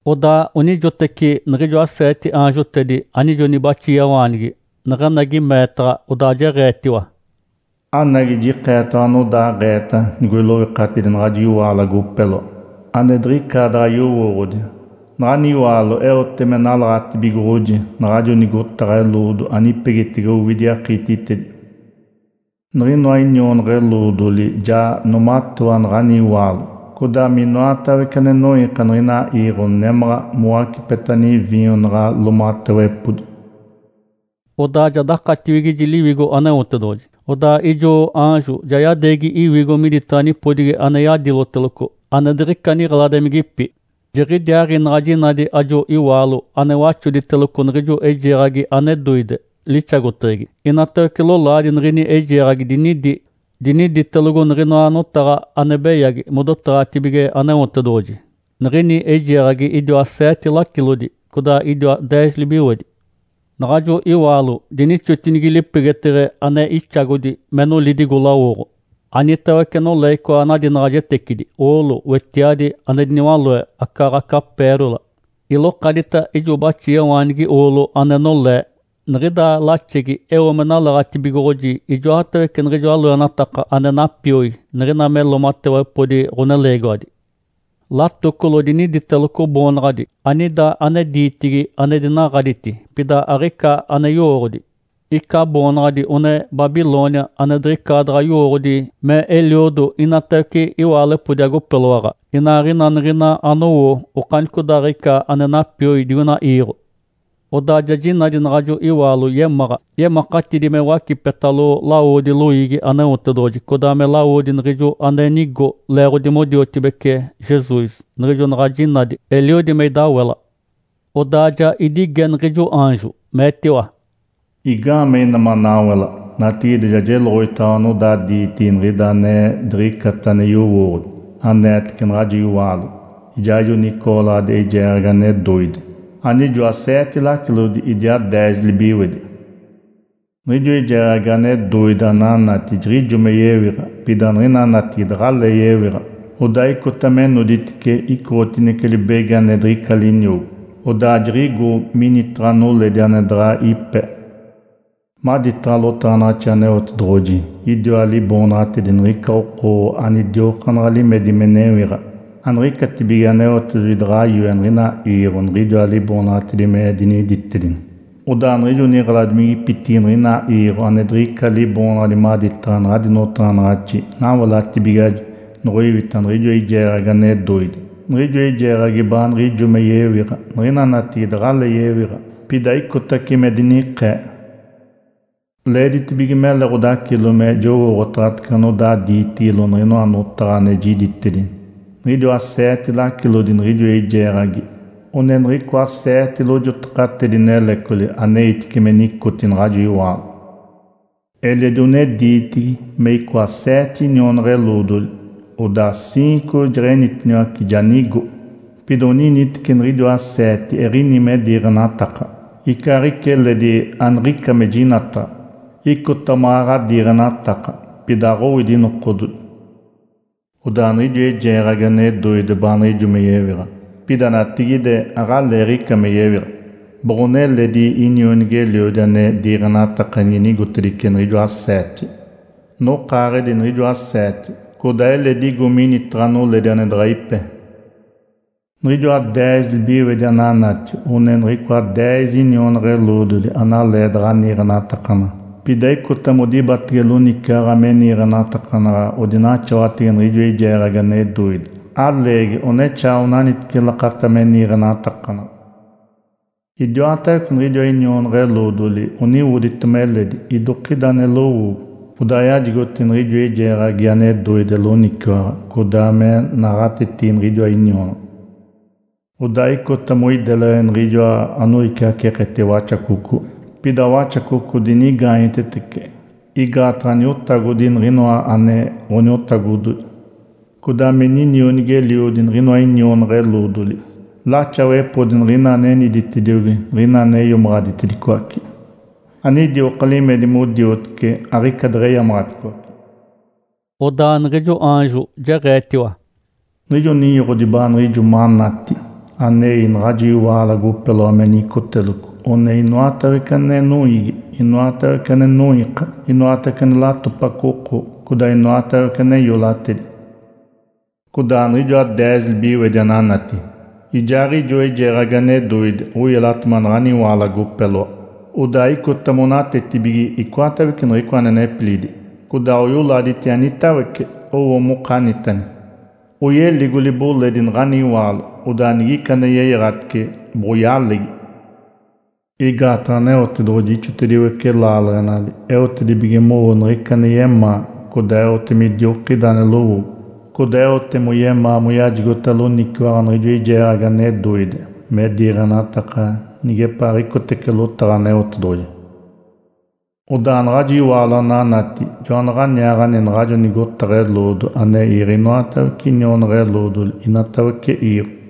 Odaa onijoteci niɡ̶ijoa seete aanjotedi anijo nibaxiawaanigi neɡ̶enagi meetaɡ̶a, odaa jeɡ̶eetiwa, “Anagi, jikeetaɡ̶awa anodaaɡ̶eeta nigoiloikatidi naɡ̶ajo iwaalo agopeloa, ane diɡ̶icaadaɡ̶a yowooɡ̶odi. Naɡ̶ani iwaalo eote me nalaɡ̶atibigoɡ̶oji naɡ̶ajo nigotaɡ̶a eloodo anipegitege owidi akiititedi. Niɡ̶inoa inionaɡ̶a-eloodoli ja noomatewa naɡ̶ani iwaalo, codaa minoatawece ane noiika niɡ̶ina iiɡ̶o nemáɡ̶a mowacipeta niviinyo naɡ̶a loomatewepodi.” Odaa ja dakatiwigiji Liwigo Aneotedoɡ̶oji, odaa ijo aanjo ja yadeegi iwigo miditaɡ̶a nipodigi ane yadiloteloco ane diɡ̶ica niɡ̶eladimigipi. Jiɡ̶idiaaɡ̶i naɡ̶a jinadi ajo iwaalo ane waxoditeloco niɡ̶ijo eijeeɡ̶agi ane doide, lixagoteɡ̶egi. Inatawece lolaadi niɡ̶ini eijeeɡ̶agi dinidi, diniditelogo niɡ̶inoa notaɡ̶a ane beyagi modotaɡ̶atibige Aneotedoɡ̶oji. Niɡ̶ini eijeeɡ̶agi idiwa seete lacilodi, codaa idiwa deez libiwedi. Naɡ̶ajo iwaalo dinixotinigi lipegeteɡ̶e ane ixagodi, me nolidigo lawoɡ̶o. Anitawece nolee icoa nadinaɡ̶ajetecidi oolo, wetiadi ane diniwaloe, acaaɡ̶aca “pérola”. Ilokadita ijo baxiawaanigi oolo ane nolee, niɡ̶ida laxegi eo me nalaɡ̶atibigoɡ̶oji ijoatawece niɡ̶ijoa loenataka ane napioi niɡ̶ina me loomatewepodi ɡ̶oneleegiwadi. Latocolo diniditeloco boonaɡ̶adi, anida ane diitigi, ane dinaɡ̶aditi, pida aɡ̶ica ane yowooɡ̶odi. Ica boonaɡ̶adi one, “Babilônia ane diɡ̶icaadaɡ̶a yowooɡ̶odi me eliodo inatawece iwaalepodi agopeloaɡ̶a, inaaɡ̶ina niɡ̶ina anowo okanicodaaɡ̶ica ane napioi digoina iiɡ̶o.” Odaa ja jinadi naɡ̶ajo iwaalo yemáɡ̶a, yemakatidi me wacipetalo lawodi loiigi Aneotedoɡ̶oji, codaa me lawodi niɡ̶ijo ane nigo leeɡ̶odi modiotibece Jesus. Niɡ̶ijo naɡ̶a jinadi, eliodi me idawela. Odaa ja idige niɡ̶ijo aanjo, meetiwa, “Igaamee ina manawela? Natigide ja jeloɡ̶oditaɡ̶awa anodaa diitigi niɡ̶ida ane diɡ̶icata ane yowooɡ̶odi, aneetece naɡ̶ajo iwaalo, ijaaɡ̶ijo nicooɡ̶oladi eijeeɡ̶agi ane doide, anijoa seete lacilodi, idiaa deez libiwedi. Niɡ̶ijo eijeeɡ̶agi ane doide ananati jiɡ̶ijo me yewiɡ̶a, pida niɡ̶ina natigide aɡ̶alee yewiɡ̶a. Odaa icota me noditice icoɡ̶otinece libegi ane diɡ̶ica liniogo, odaa jiɡ̶igo minitaɡ̶a noledi ane daɡ̶a ipe. Maditaɡ̶a lotaɡ̶anaɡ̶axi Aneotedoɡ̶oji idiwa liboonaɡ̶atedi niɡ̶ica oko anidiokaanaɡ̶a limedi me newiɡ̶a. Aniɡ̶icatibige Aneotedoɡ̶oji daɡ̶a yoe niɡ̶ina iiɡ̶o niɡ̶idiwa liboonaɡ̶atedi me diniditedini. Odaa niɡ̶ijo niɡ̶eladimigipitigi niɡ̶ina iiɡ̶o ane diɡ̶ica liboonaɡ̶adi maditaɡ̶a naɡ̶adi notaɡ̶anaɡ̶axi nawelatibigiwaji nigoiwita niɡ̶ijo eijeeɡ̶agi ane doide. Niɡ̶ijo eijeeɡ̶agi baanaɡ̶a ijo me yewiɡ̶a, niɡ̶ina natigide aɡ̶alee yewiɡ̶a. Pida icotace me dinikee. Leeditibige mele ɡ̶odacilo me jowooɡ̶otaɡ̶atece anodaa diitigilo niɡ̶inoa notaɡ̶a ane jiditedi. Niɡ̶idiwa seete lacilodi niɡ̶ijo eijeeɡ̶agi — one niɡ̶icoa seete lojotaɡ̶atedi-nelecoli aneitice me nicote naɡ̶ajo iwaalo. Eledi one diitigi — me icoa seete inionaɡ̶a-eloodoli. Odaa ciinco jeɡ̶enitiniwace, ja nigo. Pida oniniteci niɡ̶idiwa seete eɡ̶ini me diiɡ̶enataka, icaaɡ̶ica eledi aniɡ̶ica me jinataɡ̶a. Icota maɡ̶aɡ̶a diiɡ̶enataka, pida aɡ̶owidi nokododi. Odaa niɡ̶ijo eijeeɡ̶agi ane doide baaniɡ̶ijo me yewiɡ̶a, pida natigide aɡ̶aleeɡ̶ica me yewiɡ̶a, boɡ̶one eledi inionigi-eliodi ane diiɡ̶enataka nige nigotedice niɡ̶ijoa seete. Nokaaɡ̶edi niɡ̶ijoa seete, codaa eledi igo minitaɡ̶a noledi ane daɡ̶a ipe. Niɡ̶ijoa deez libiwedi ananati — one niɡ̶icoa deez inionaɡ̶a-eloodoli analee daɡ̶a niiɡ̶enatakanaɡ̶a, pida icota modibatege loniciwaɡ̶a me niiɡ̶enatakanaɡ̶a odinaxawatege niɡ̶ijo eijeeɡ̶agi ane doide, aleegi, onexaa onaniteci lakata me niiɡ̶enatakanaɡ̶a. Idiwatawece niɡ̶idiwa inionaɡ̶a-eloodoli oniwoditema eledi, idokida ane lowoogo. Odaa oyajigota niɡ̶ijo eijeeɡ̶agi ane doide loniciwaɡ̶a, codaa me naɡ̶atetigi niɡ̶idiwa inionaɡ̶a. Odaa icota moideleɡ̶e niɡ̶ijoa anoiciaceeketege Waxacoco, pida Waxacoco dinigaanyetetece, igaataɡ̶a Niotagodi niɡ̶inoa ane ɡ̶oniotagododi, codaa me Ninionigi-eliodi niɡ̶inoa inionaɡ̶a-eloodoli. Laxawepodi niɡ̶ina aneniditediogi, niɡ̶ina ane iomaɡ̶aditedicoace, anidioka limedi modiotece aɡ̶ica deɡ̶eyamaɡ̶aticoace.” Odaa niɡ̶ijo aanjo jeɡ̶eetiwa, “Niɡ̶ijo ninyoɡ̶odi baaniɡ̶ijo manati anei naɡ̶ajo iwaalo agopeloa me nicoteloco one inatawece ane noiigi, inoatawece ane noiika, inoatawece ane latopaco oko, codaa inoatawece ane iolatedi. Codaa niɡ̶ijoa deez libiwedi ananati, ijaaɡ̶ijo eijeeɡ̶agi ane doide oyelatema naɡ̶ani iwaalo agopeloa. Odaa icota monatetibige icoatawece niɡ̶icoa ane nepilidi, codaa oyoladiti anitawece owo mokanitani. Oyeligo liboledi naɡ̶ani iwaalo, odaa nigica ane yeyaɡ̶atice, boɡ̶oyalegi. Igaataɡ̶a Aneotedoɡ̶oji ixotediwece laaleɡ̶enali eotedibige mowo niɡ̶ica ane yemaa, codaa eote midokida ane lowoogo. Codaa eote moyemaa moyajigota loniciwaɡ̶a niɡ̶ijo eijeeɡ̶agi ane doide me diiɡ̶enataka nigepaaɡ̶icotece lotaɡ̶a Aneotedoɡ̶oji. Odaa naɡ̶ajo iwaalo ananati — jonaɡ̶aniaaɡ̶ani naɡ̶ajo nigotaɡ̶a eloodo ane iiɡ̶e inoatawece inionaɡ̶a-eloodoli inatawece iiɡ̶o.”